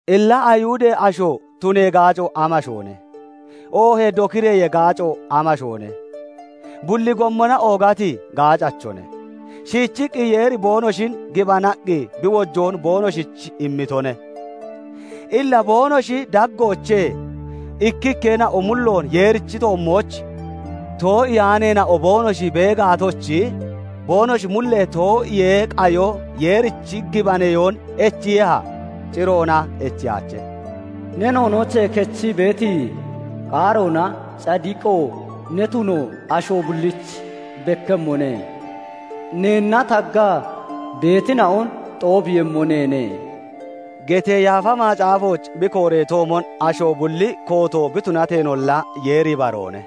Illa Ayihudee asho tunee gaaco amashoone? Oohee dokireyee gaaco amashoone? Bulli gommona oogati gaacachone. Shiichiqqi Yeeri boonoshin gibanaqqi bi wochoon boonoshich immitone. Illa boonoshi daggoochee ikkikkeena'o mulloon Yeerichi toommooch too'iyaaneena'o boonoshi bee gaatochi, boonoshi mullee too'iyee qayo Yeerichi gibaneyoon echiiyeha? Ciroona echiyaache; "Ne noonoochee kechii beeti qaaroona cadiqo ne tuno asho bullich bekkemmone; Neenna taggaa beetina'on xoobiiyemmo neene" getee Yaafa Macaafooch bi kooreetoomon, asho bulli kooto bi tunateenolla, Yeeri ibaroone.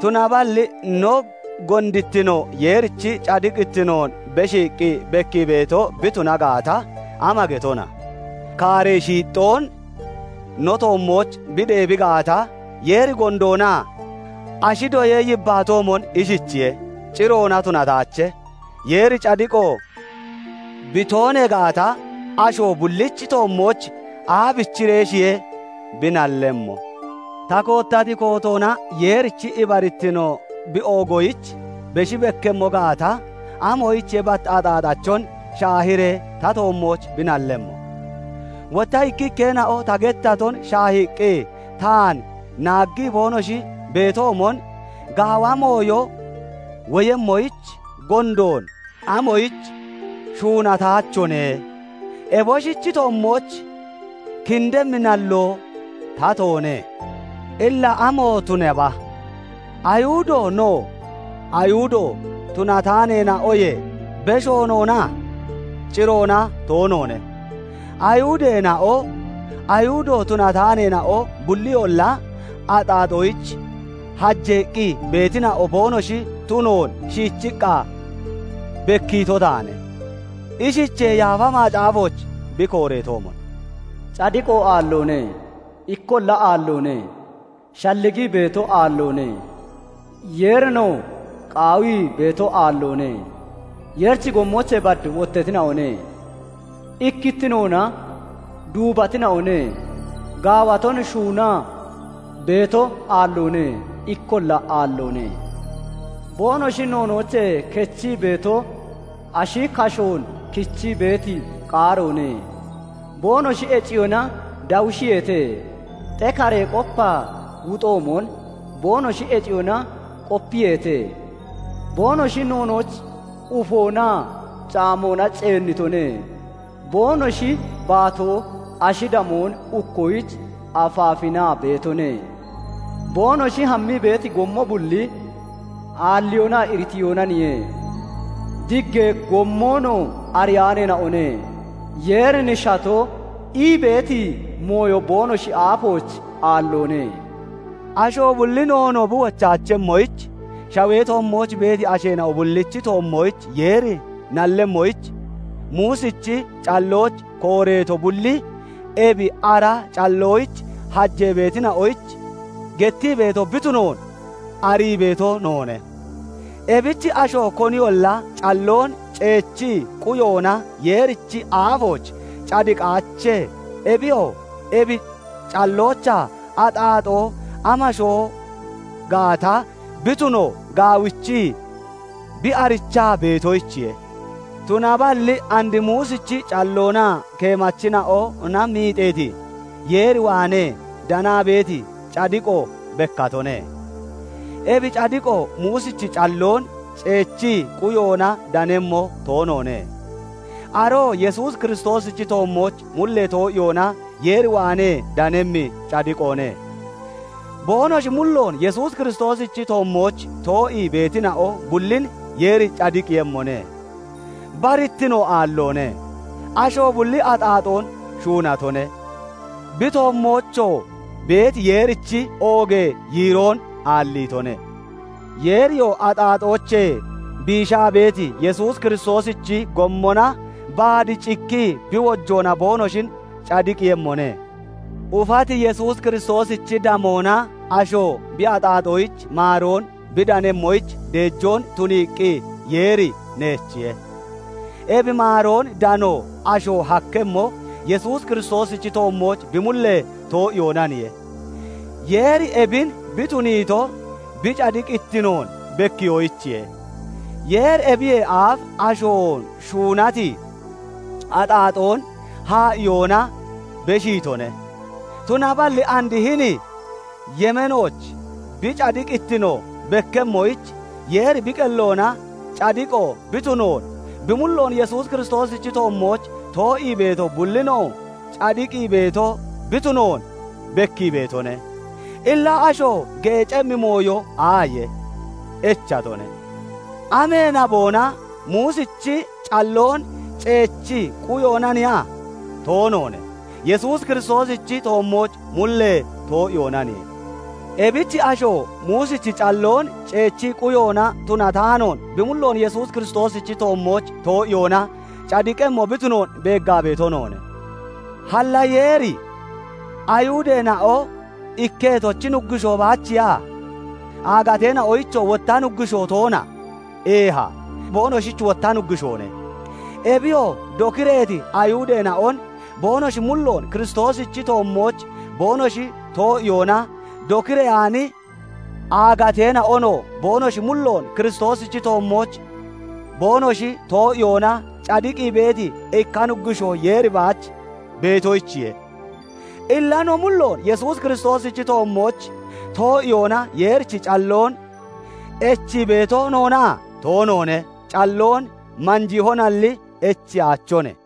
Tunaballi no gondittino Yeerichi cadiqittinoon beshiiqqi bekkii beeto bi tuna gaata, ama getona? Kaaree shiixxoon no toommooch bi deebi gaata, Yeeri gondoona? Ashi doyee yibbaatoomon ishichiyoye. Ciroona tunataache; Yeeri cadiqo bi toonee gaata, asho bullichi toommooch aabichireeshiye bi nallemmo? Ta koottati kootoona Yeerichi ibarittino bi oogoyich beshi bekkemmo gaata, amoyichiye bat axaaxachon shaahiiree ta toommooch bi nallemmo? Wotta ikkikkeena'o ta gettaton shaahiiqqi taan naaggii boonoshi beetoomon "Gaawa mooyo woyemmoyich gondoon amoyich shuunataachone?" Eboshichi toommooch kindemmi nalloo tatoone. Illa amo tunaba? Ayihudo no, Ayihudo tunataaneena'oyee besho noona? Ciroona toonoone. Ayihudeena'oo, Ayihudo tunataaneena'oo bulliyolla axaaxoyich hajeeqqi beetina'o boonoshi tunoon shiichiqqa bekkiito taane. Ishichee Yaafa Macaafooch bi kooreetoomon, "Cadiqo aalloone; ikkolla aalloone; shalligii beeto aalloone; Yeerinoo qaawii beeto aalloone. Yeerichi gommoochee bad wottatina'one; ikkittinoona duubatina'one; gaawaton shuunaa beeto aalloone; ikkolla aalloone; boonoshi noonoochee kechii beeto ashi kashoon kichii beeti qaaroone; boonoshi heciyoona dawushiyeete; xekare qopaa wuxoomon, boonoshi heciyoona qopiyeete; boonoshi noonooch ufonaa caamoona ceennitone. Boonoshi baatoo ashi damoon ukkoyich afaafinaa beetone; boonoshi hammii beeti gommo bulli aalliyoonaa iritiyoonaniye; diggee gommonoo ariyaaneena'one. Yeerin shato' ii beeti mooyo boonoshi aafooch aalloone." Asho bulli noonoo bi wochaachemmoyich, shawee toommooch beeti asheena'o bullichi toommooch Yeeri nallemmoyich, Muusichi callooch kooreeto bulli ebi ara calloyich hajee beetina'oyich gettii beeto bi tunoon arii beeto noone. Ebich asho koniyolla calloon ceechii quyoona Yeerichi aafooch cadiqaache; ebiyoo ebi calloochaa axaaxoo amashoo gaata bi tuno gaawichii bi arichaa beetoyichiye. Tunaballi and Muusichi calloonaa keemachina'ona miixeeti, Yeer waanee danaa beeti cadiqoo bekkatone; ebi cadiqoo Muusichi calloon ceechii quyoona danemmo toonoone. Aroo Yesuus Kiristoosichi toommooch mullee too'iyoona Yeer waanee danemmi cadiqoone. Boonoshi mulloon Yesuus Kiristoosichi toommooch too'ii beetina'o bullin Yeeri cadiqiiyemmone. Barittino aalloone; asho bulli axaaxoon shuunatone; bi toommoochoo beeti Yeerichi oogee yiiroon aalliitone; Yeeriyoo axaaxoochee biishaa beeti Yesuus Kiristoosichi gommona baad cikki bi wojoona boonoshin cadiqiiyemmone. Ufati Yesuus Kiristoosichi damoona asho bi axaaxoyich maaroon bi danemmoyich deejoon tuniiqqi Yeeri neechiye; ebi maaroon dano asho hakkemmo, Yesuus Kiristoosichi toommooch bi mullee too'iyoonaniye. Yeeri ebin bi tuniito bi cadiqittinoon bekkiyoyichiye. Yeeri ebiyee aaf asho shuunati axaaxoon haa'iyoona beshiitone; tunaballi and hini yemeenooch bi cadiqittino bekkemmoyich, Yeeri bi qelloona cadiqo bi tunoon, bi mulloon Yesuus Kiristoosichi toommooch too'ii beeto bullinoo cadiqii beeto bi tunoon bekkii beetone. Illa asho geecemmi mooyo aaye? Echatone. Amee naboona? Muusichi calloon ceechii quyoonaniya? Toonoone. Yesuus Kiristoosichi toommooch mullee too'iyoonaniye. Ebich asho Muusichi calloon ceechii quyoona tunataanoon, bi mulloon Yesuus Kiristoosichi toommooch too'iyoona cadiqemmo bi tunoon beeggaa beeto noone. Halla Yeeri Ayihudeena'o ikketochi Nuggushoo baachiya? Aagateena'oyichoo wotta Nuggushoo toona? Eeha, boonoshich wotta Nuggushoone. Ebiyoo dokireeti Ayihudeena'on boonoshi mulloon Kiristoosichi toommooch boonoshi too'iyoona, dokireyaani aagateena'onoo boonoshi mulloon Kiristoosichi toommooch boonoshi too'iyoona cadiqii beeti ikka Nuggushoo Yeeri baach beetoyichiye. Illa no mulloon Yesuus Kiristoosichi toommooch too'iyoona Yeerichi calloon echii beeto noona? Toonoone. Calloon manjiihonalli echiyaachone.